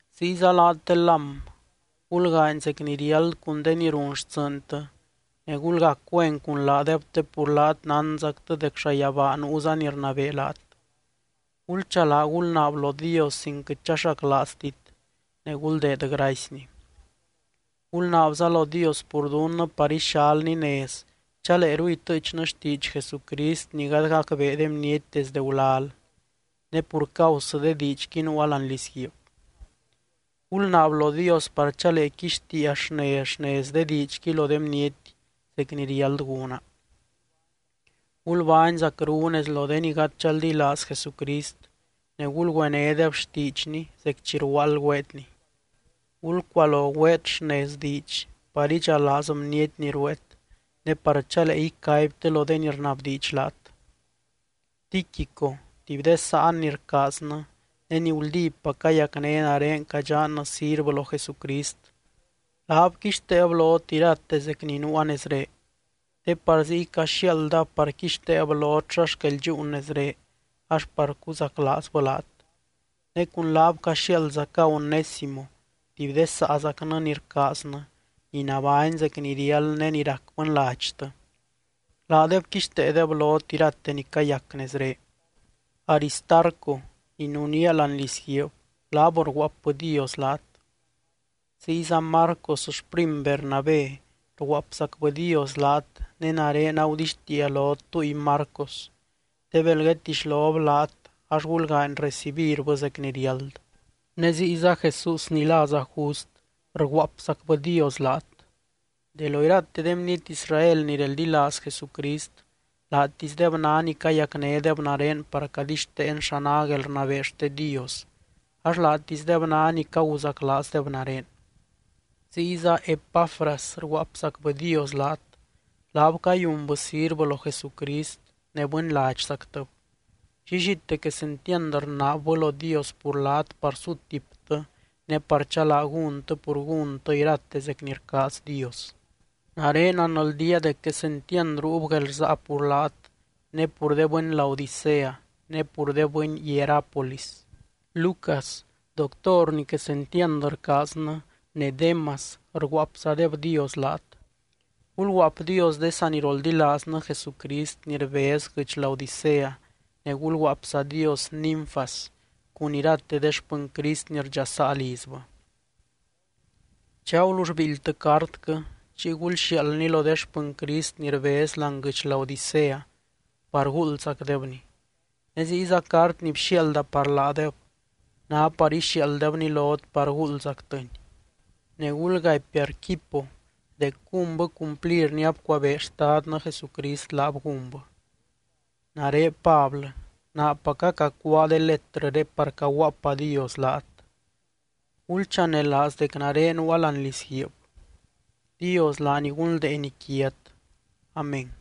Ziyza laat de lám, gulgaany zec ni riáld cun de ni run xtsɨɨntɨ ne gulgac güen cun laadeb te pur laat nánzactɨ dec llayabaa nuuza ni rnabee laat. Gulchalaa gulnaab lo Dios sin quɨt chaxaclaaztit ne guldeed gracyny. Gulnaabza lo Dios pur dunnɨ par ixalny nez chaleeru itɨɨchnɨ xtiidx Jesucrist ni gady gacbee de bniety desdɨ gulal. Ne pur causɨ de diidxqui nuua láani lizguiib. Gulnaab lo Dios par chalee quixtiia xnez, xnez de diidxqui lo de bniety, zec ni riáld gúna. Gulbány zacru nez lo de ni gady chaldilaaz Jesucrist, ne gulgüenédeb xtiidxny zec chi rguaald güeetni. Gulcualo güeet xnez diidx par idxalaaz bniety ni rueet, ne par chalee icaibtɨ lo de ni rnabdiidx laat. Tíquico, tuby de sáan ni rcaaznɨ, ne ni guldípac cayacné nare cadxannɨ sirvɨ lo Jesucrist, laab quixteeb lot irate zec ni nuua nezré. Te par ziy caxiaaldab par quixteeb lot xa xquel dxúun nezré, ax par cuzaclaazbɨ laat. Ne cun laab caxiaaldzaca Onésimo tuby de saazacnɨ ni rcaaznɨ, ni nabány zec ni riáld ne ni rac bɨnladxtɨ. Laadeb quixteedeb lot irate ni cayac nezré. Aristarco, ni nunía láani lizguiib, laab rguaapbɨdios laat. Ziyza Marcos xprim Bernabé rguaapzacbɨdios laat ne nare agudixtiia lot túy Marcos te bel guedtixlob laat ax gulgaany recibirbɨ zec ni riáld. Ne ziyza Jesús ni láza Just rguaapzacbɨdios laat. De lo irate de bniety Israel ni reldilaaz Jesucrist laatisdeb ná ni cayacnédeb nare par cadixteen xa ná guelrnabee xte Dios ax laatisdeb ná ni caguzaclaazdeb nare. Ziyza Epafras rguaapzacbɨdios laat. Laab cayunbɨ sirvɨ lo Jesucrist, ne bɨnladxzactɨb. Llillite quesentiand rnaabbɨ lo Dios pur laat par sutiptɨ ne par chalaa gúntɨ pur gúntɨ irate zec ni rcaaz Dios. Nare nanldía dec quesentiand ruub guelrsaa pur laat ne pur de bɨny Laodicea ne pur de bɨny Hierápolis. Lucas, doctor ni quesentiand rcaaznɨ, ne Démas rguaapzadebdios laat. Gulguaapdios de saniroldilaaznɨ Jesucrist ni rbez guɨdx Laodicea ne gulguaapzadios Ninfas cun irate de xpɨny Crist ni rdxasaa lizbɨ. Chi agulull biildytɨ cartquɨ, chiy gulxiaaldni lo de xpɨny Crist ni rbez láani guɨdx Laodicea par guuldzacdebni. Ne ziyza cart ni bxiaalda par laadeb ná par ixiaalddebni lot par guuldzactɨni. Ne gulgaipy Arquipo dec gúnbɨ cumplir ni abcuabee Xtadnɨ Jesucrist laab gúnbɨ. Nare Pablɨ, naapaca cacuáa de letrɨré par cayuaapadios laat. Gulchanelaaz dec nare nuua láani lizguiib. Dios laany gunldeeny quiat. Amén.